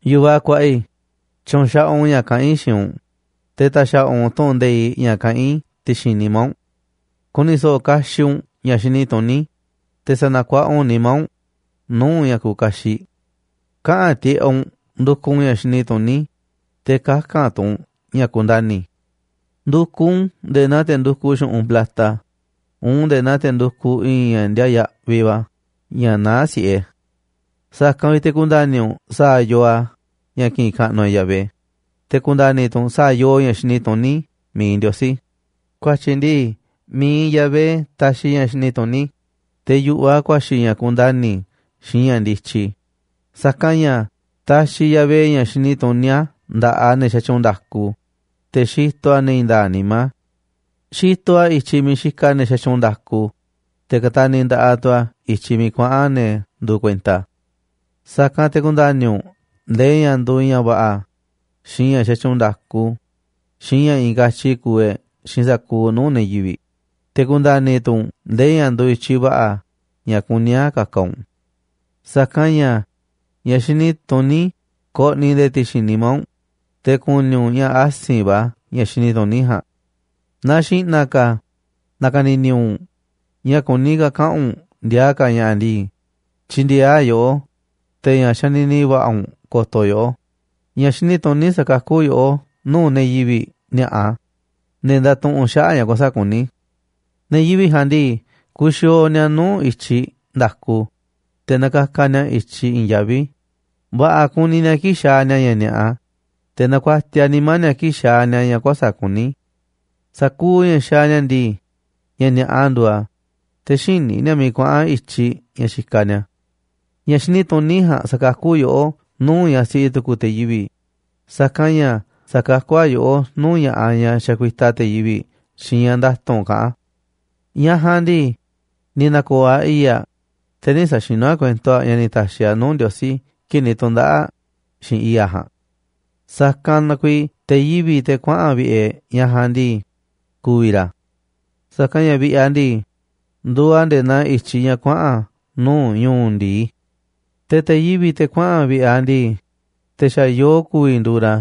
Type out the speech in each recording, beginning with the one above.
Yu̱vaꞌ kuaꞌa i̱, tyu̱u̱n xaꞌaꞌ u̱nꞌ ña̱ kaꞌán i̱ xiinꞌ u̱nꞌ, te̱ ta̱xa̱ꞌa̱ u̱nꞌ tu̱ꞌu̱n nde̱iꞌ ña̱ kaꞌán i̱ ti̱xi̱n nimá u̱nꞌ. Ku̱ni̱ so̱ꞌo̱ kaxiꞌ u̱nꞌ ña̱ xini tuní, te̱ sa̱na̱ kuaꞌa u̱nꞌ nimá u̱nꞌ nuu̱ꞌ ña̱ kuuꞌ kaxiꞌ. Kaꞌa̱n tiꞌeꞌ u̱nꞌ ndukuꞌ u̱nꞌ ña̱ xini tuní, te̱ kaka̱n tu̱ u̱nꞌ ña̱ ku̱ndani̱. Ndu̱kuꞌ u̱nꞌ u̱n nde̱e̱ naa te̱ ndukuꞌ xu̱ꞌunꞌ plata, uun nde̱e̱ naa te̱ ndukuꞌ i̱i̱n ña̱ ndiaa yaꞌviꞌ va̱ ña̱ naá si̱ꞌe. Sa̱kanꞌ vi̱ꞌ te̱ ku̱nda̱ni̱ u̱nꞌ sa̱a̱ yoo a̱ ña̱ ki̱ꞌi̱n kaꞌnuꞌ e̱ꞌ Yahvé, te̱ ku̱nda̱ni̱ tu̱ u̱nꞌ sa̱a̱ yoo ña̱ xini tuní mi̱iꞌ Ndiosí. Ku̱a̱tyi̱ ndii, mi̱iꞌ Yahvé taxiꞌ ña̱ xini tuní, te̱ yu̱ꞌuꞌ a̱ ku̱a̱xi̱ ña̱ kundani̱ xiinꞌ ña̱ ndityi. Sa̱kanꞌ ña̱ taxiꞌ Yahvé ña̱ xini tuní a̱ nda̱ꞌaꞌ ne̱ xatyuunꞌ nda̱ku, te̱ xitoꞌ a̱ ne̱ i̱i̱n nda̱a̱ꞌ nimá. Xitoꞌ a̱ i̱tyiꞌ miiꞌ xikaꞌ ne̱ xatyuunꞌ nda̱ku, te̱ kataniꞌ nda̱ꞌaꞌ tu̱ a̱ i̱tyiꞌ miiꞌ kuaꞌa̱n ne̱ nduuꞌ kuenta a̱. Sa̱kanꞌ te̱ ku̱nda̱ni̱ u̱nꞌ ndee ña̱ nduuꞌ ña̱ va̱ꞌa̱, xiinꞌ ña̱ xatyuunꞌ nda̱ku, xiinꞌ ña̱ i̱i̱n katyi kuuꞌ e̱ꞌ xiinꞌ sa̱kuuꞌ nuu̱ꞌ ne̱ yivi̱ꞌ, te̱ ku̱nda̱ni̱ tu̱ u̱nꞌ ndee ña̱ nduuꞌ i̱tyiꞌ va̱ꞌa̱ ña̱ kuní a̱ ka̱ka̱ u̱nꞌ. Sa̱kanꞌ ña̱ ña̱ xini tuní ko̱ꞌni̱ nde̱e̱ ti̱xi̱n nimá u̱nꞌ, te̱ ku̱ni̱ u̱nꞌ ña̱ asi̱nꞌ va̱ ña̱ xini tuní ja̱a̱nꞌ. Naaꞌ xi̱ꞌna̱ ka̱ na̱ka̱ni̱ni̱ u̱nꞌ ña̱ kuní ka̱ kaꞌa̱n u̱nꞌ ndiaa ka̱ ña̱ꞌa̱ ndii, tyi̱ndi̱e̱eꞌ a̱ yoꞌó, te̱ ña̱ xanini va̱ꞌa̱ u̱nꞌ ko̱to̱ yoꞌó. Ña̱ xini tuní sa̱kakú yoꞌó nuu̱ꞌ ne̱ yivi̱ꞌ ni̱a̱ꞌa, ne̱ ndatuꞌunꞌ xaꞌa̱ꞌ ña̱ kuäsa̱ꞌ kuní. Ne̱ yivi̱ꞌ ja̱a̱nꞌ ndii, kuxiooꞌ ni̱a̱ nuu̱ꞌ i̱tyiꞌ nda̱ku, te̱ nakakaꞌ ni̱a̱ i̱tyiꞌ i̱i̱n yaví. Va̱ꞌa̱ kuni ni̱a̱ kii̱ꞌ xaaꞌ ni̱a̱ ña̱ ni̱a̱ꞌa, te̱ nakuatiaꞌ nimá ni̱a̱ kii̱ꞌ xaaꞌ ni̱a̱ ña̱ kuäsa̱ꞌ kuní. Sa̱kuuꞌ ña̱ xaaꞌ ni̱a̱ ndii, ña̱ ni̱a̱ꞌa nduuꞌ a̱, te̱ xïní ni̱a̱ miiꞌ kuaꞌa̱n i̱tyiꞌ ña̱ xikaꞌ ni̱a̱. Ña̱ xini tuní ja̱a̱nꞌ sa̱kakú yoꞌó nuu̱ꞌ ñaꞌ siꞌi tu̱ku̱ te̱ yivi̱ꞌ, saka̱nꞌ ña̱ sa̱kakú a̱ yoꞌó nuu̱ꞌ ña̱ꞌaꞌ ñaꞌ xakuitaꞌ te̱ yivi̱ꞌ xiinꞌ ña̱ nda̱tu̱nꞌ kaꞌán aꞌ. Ñaꞌ ja̱a̱nꞌ ndii, ni̱ na̱ko̱o̱ aꞌ i̱i̱ꞌ aꞌ, te̱ nï̱ sa̱xinu̱ aꞌ kuento aꞌ ña̱ ni̱ ta̱xi̱ aꞌ nuu̱ꞌ Ndiosí kii̱ꞌ ni̱ tu̱ndaꞌa̱ꞌ aꞌ xiinꞌ i̱i̱ꞌ aꞌ ja̱a̱nꞌ. Sa̱kanꞌ na kuiiꞌ te̱ yivi̱ꞌ, te̱ kuaꞌa̱n vi̱ꞌe̱ ñaꞌ ja̱a̱nꞌ ndii, ku̱vi̱ ra̱, sa̱kanꞌ ña̱ vi̱ꞌe̱ aꞌ ndii, nduuꞌ a̱ nde̱e̱ naa i̱tyiꞌ ña̱ kuaꞌa̱n nuu̱ ñu̱u̱ ndi̱i. Te̱ te̱ yivi̱ꞌ, te̱ kuaꞌa̱n vi̱ꞌe̱ aꞌ ndii, te̱ xa̱ yoo ku̱vi̱ nduuꞌ ra̱,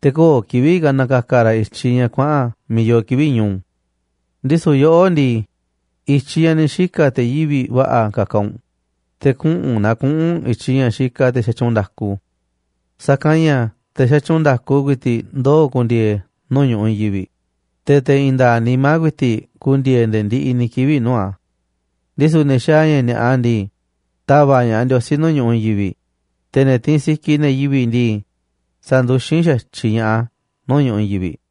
te̱ köo̱ꞌ kivi̱ꞌ ka̱ na̱ka̱ka̱ ra̱ i̱tyiꞌ ña̱ kuaꞌa̱n miiꞌ yoo kivi̱ꞌ ñu̱u̱. Ndisu̱ yoꞌó ndii, i̱tyiꞌ ña̱ ni̱ xika̱ te̱ yivi̱ꞌ va̱ꞌa̱ ka̱ka̱ u̱nꞌ, te̱ kuꞌu̱n naa kuꞌu̱n u̱nꞌ i̱tyiꞌ ña̱ xikaꞌ te̱ xa̱tyuunꞌ nda̱ku. Sa̱kanꞌ ña̱ te̱ xatyuunꞌ nda̱ku ku̱i̱ti̱ꞌ ndoo̱ ku̱ndi̱e̱e̱ nuu̱ꞌ ñu̱ꞌuꞌ i̱i̱n yivi̱ꞌ, te̱ te̱ i̱i̱n nda̱a̱ꞌ nimá ku̱i̱ti̱ꞌ ku̱ndi̱e̱e̱ nde̱e̱ ndiꞌiꞌ ni̱ kivi̱ꞌ nuu̱ꞌ a̱. Ndisu̱ ne̱ xaaꞌ ña̱ ni̱a̱ꞌa ndii, ta̱va̱ꞌ ña̱ꞌaꞌ Ndiosí nuu̱ꞌ ñu̱ꞌuꞌ i̱i̱n yivi̱ꞌ, te̱ ne̱ tiinꞌ sikiꞌ ne̱ yivi̱ꞌ ndii, sa̱nduxín xa̱tyiꞌ ña̱ꞌaꞌ a̱ nuu̱ꞌ ñu̱ꞌuꞌ i̱i̱n yivi̱ꞌ.